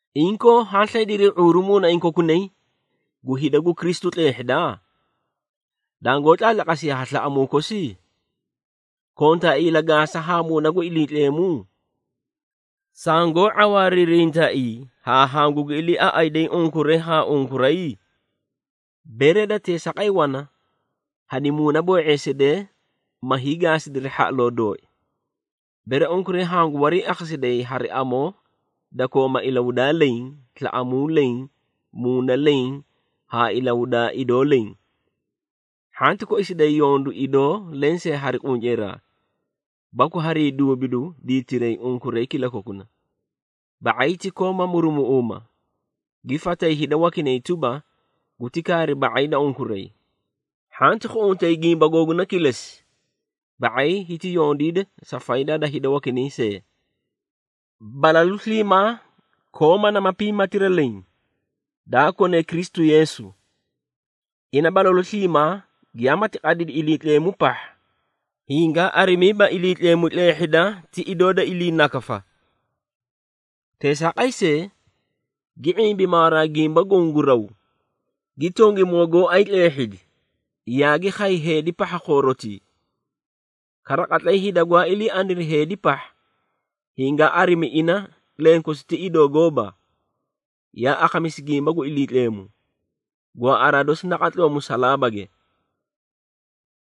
Inkoo, haã slaydirii ⁄uuru muunaiĩ kokunay, gu hida gu Kristu tleehhida? Dangoó tlaatlaqasiyaa ha slaꞌamuu kosi? Kontaaii ilagaasa haa Muuna gu Iliitleemu? Sangoó ⁄awaariirintaai haa hangugi iliiaꞌayday unkuray haa unkuray? Bere da teesaaqay wana, hani muunaboo⁄eesidee ma hiigaasidiri hhaꞌaloo dooi, bere unkuray hangu wariiakhasiday hari amoo da kooma ilahudaa leẽ, slaꞌamuu leẽ, muuna leẽ haa ilahudaa idoo leẽ. Hhanti koisiday yondu idoo lensee hari qunceeraa, baku harii duubidu diitiray unkuray kilakokuna, ba⁄ay ti kooma murumuꞌuuma, gi fatay hida wakinay tuba, guti kaari ba⁄ay da unkuray. Hhanti khuꞌuntay gimba googuna kilesi, ba⁄ay hiti yondiida sa faydaa da hida wakinay see. Balalu sliimaa kooma nama piimaatira leẽ, daa kone Kristu Yeesu. Ina balalu sliimaa giyamati qadidi Iliitleemu pahha, hingaa arimiiba Iliitleemu tleehhida ti idoo da iliinakafa. Teesaaqay see, gi ⁄imbi mawaraa gimba goõ gu raw, gi tongimoo gooay tleehhidi, yaagi khay heedi pahha khoorotii. Kara, qatlay hida gwaa ilii aniri heedi pahha, hingaa arimi ina lenkosi ti idoo gooba, yaa akhamisi gimba gu Iliitleemu, gwaaꞌaraa dosi naqatloo musalaabage.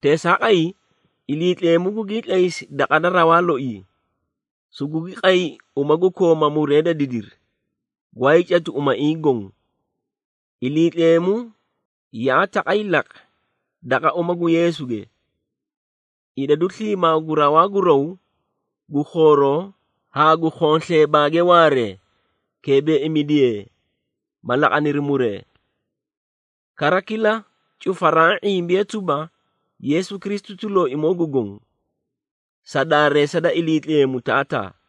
Teesaaqay, Iliitleemu gugii tlaysi daqa da rawaa loii, sugugi qay uma gu kooma muree da didiru, gwaayii catu umaiĩ goõ. Iliitleemu yaa taqay laqi, daqa uma gu Yeesuge, idadu sliimaa gu rawaa gu raw, gu khooroo haa gu khonsleebaage waaree, keebeeimidiyee, ma laqaniri muree. Kara kila cufaraã ⁄imbiye tuba, Yeesu Kristu ti Looimoo gu Goõ, sa daareesa da Iliitleemu Taataa.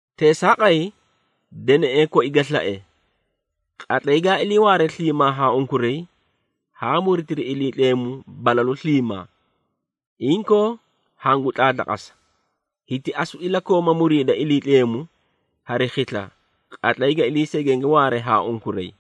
Teesaaqay, deneꞌee koi ga slae, qatlay gaa ilii waare sliimaa haa unkuray, haa muritiri Iliitleemu balalu sliimaa. Inkoo hangu tlaatlaqasa, hiti asu ilakooma muriida Iliitleemu hari khisla, qatlay ga ilii segenge waare haa unkuray.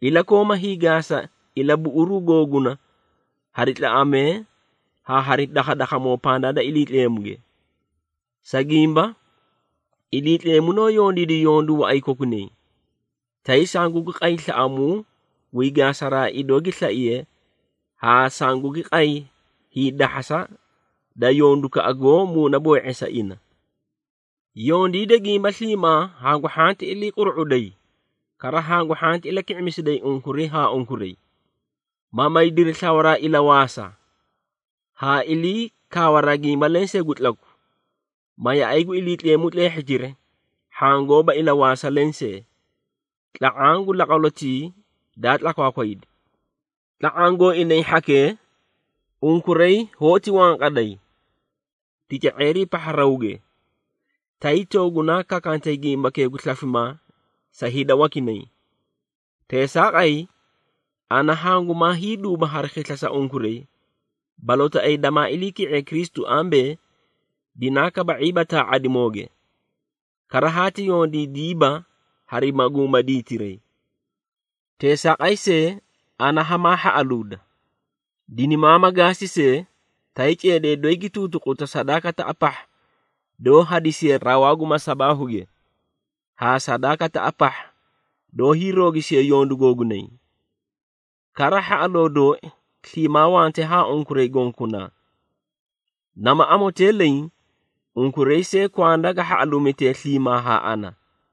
Ilakooma hiigaasa ilabuꞌuruu googuna hari tlaꞌamee haa hari dakhadakhamoo pandaa da Iliitleemuge. Sa gimba, Iliitleemu noó yondiidi yondu waꞌay kokunay, tay sangugi qay slaꞌamuu guyii gaasaraa idoo gi slaiye haa sangugi qay hiidahhasa da yondukaꞌa goó muunaboo⁄eesa ina. Yondiida gimba sliimaa hangu hhanti ilii quru⁄uday, kara hangu hhanti ilaki⁄imisiday unkuray haa unkuray, ma maydiri slawaraa ilawaasa, haa ilii kaawaraa gimba lensee gu tlaku, ma yaꞌay gu Iliitleemu tleehhitiri hhaã gooba ilawaasa lensee, tla⁄aã gu laqwalotii daa tlakwaakwaydi. Tla⁄aã gooinay hhakee, unkuray hoóti wanqaday, tica⁄eerii pahha rawge, tay toogunaa kakantay gimbakee gu slafimaa sa hida wakinay. Teesaaqay, ana hangumaa hiiduuba hari khisla sa unkuray balootaꞌayi damaa iliiki⁄iye Kristu ambee, dinaa kaba⁄iiba taa⁄adimooge, kara haati yondiidiiba hari maguuma diitiray. Teesaaqay see, ana hamaa hhaꞌaluuda, dinimaama gaasi see, tay ceedee doyi gi tuutuquta sadaakataꞌa pahha doó hadisiye rawaa gu masabaahuge, haa sadaakataꞌa pahha doó hiiroogisiye yondu googunay. Kara hhaꞌaloo dooi sliimaa wante haa unkuray gonkokunaa, nama amotee leẽ, unkuray see kwanda ga hhaꞌaluumitee sliimaa haa ana.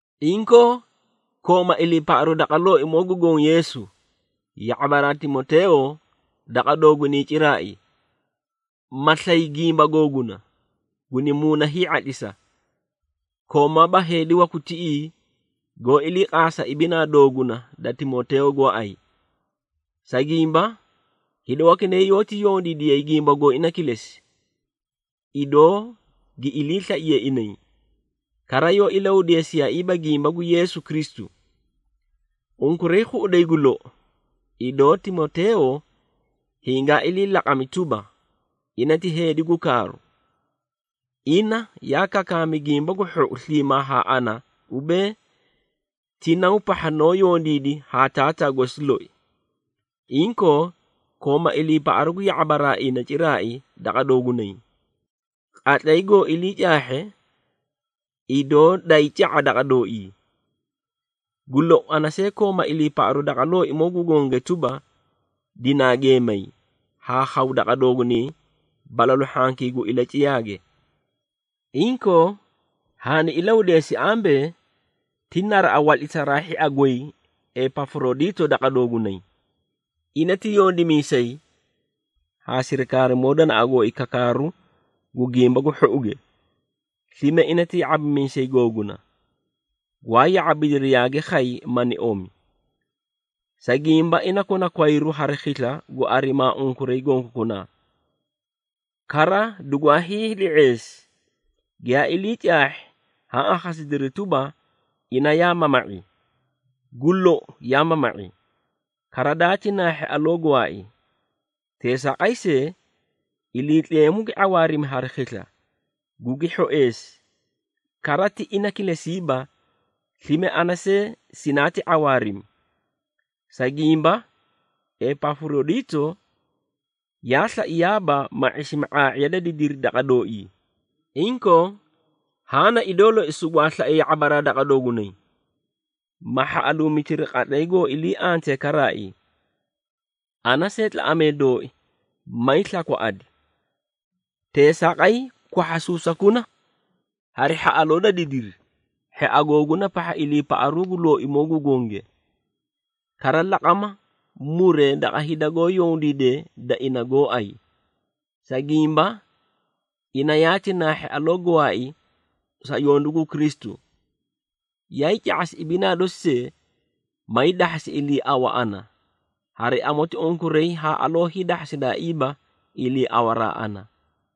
Inkoo, kooma iliipaꞌaru daqa Looimoo gu Goõ Yeesu, ya⁄abaraa Timoteeyo daqa doogunay ciraai, ma slay gimba googuna, guni muuna hii⁄atlisa. Koomaaba heedi waku tiꞌii goó iliiqaasa ibinaa dooguna da Timoteeyo gooay. Sa gimba, hida wakinay yoóti yondiidiyay gimba gooina kilesi, idoo gi iliislaiyee inay, kara yoó ilahudeesiyaaiiba gimba gu Yeesu Kristu. Unkuray khuꞌuday gu lou, idoo Timoteeyo hingaa ilii laqami tuba, ina ti heedi gu kaaru. Ina yaa kakaami Gimba gu Hhou sliimaa haa ana ubee, ti naw pahha noó yondiidi haa taataa gosi loi. Inkoo, kooma iliipaꞌaru gu ya⁄abaraa ina ciraai daqa doogunay, qatlay goo ilii caahhe, idoo daayii ca⁄a daqa dooii. Gu lou, ana see kooma iliipaꞌaru daqa Looimoo gu gonge tuba, dinaa geemay, haa khaw daqa doogunay balalu hhankii gu ilaciyaage. Inkoo, haani ilahudeesi ambee, ti naraꞌa watlisaraa hhia goy Epafurodiito daqa doogunay. Ina ti yondimiisay haa sirikaarimoo danaꞌa gooi kakaaru gu Gimba gu Hhouge, slime ina ti ya⁄abimiisay googuna, gwaa ya⁄abidiri yaagi khay, mani omi. Sa gimba, ina kona kwayru hari khisla gu arimaa unkuray gonkokunaa. Kara dugwaa hiili⁄eesi, giyaa ilii caahhi, haã akhasidiri tuba, ina yaa mama⁄i. Gu lou, yaa mama⁄i, kara daati naahhi aloo gwaai. Teesaaqay see, Iliitleemu gi ⁄awaarimi hari khisla, gugi hhoeesi, kara ti ina kilesiiba, slime ana see sinaati ⁄awaarimi. Sa gimba, Epafurodiito yaa slaiyaaba, ma ⁄isimi ⁄aa⁄iya da didiri daqa dooii. Inkoo, haã na idoo loi sugwaa slae ya⁄abaraa daqa doogunay, ma hhaꞌaluumitiri, qatlay goó ilii antee karaai, ana see tlaꞌamee dooi, mayii slakwaꞌadi. Teesaaqay, kwahhasuusakuna hari hhaꞌaloo da didiri, hhia googuna pahha iliipaꞌaru gu Looimoo gu gonge. Kara laqama muree daqa hida goó yondiidee da ina gooay. Sa gimba, ina yaati naahhi aloo gwaai sa yondu gu Kristu, yaay ca⁄asi ibinaa dosi see, may dahhasi iliiawa ana, hari amoti unkuray haa aloo hiidahhasidaaiiba iliiawaraa ana.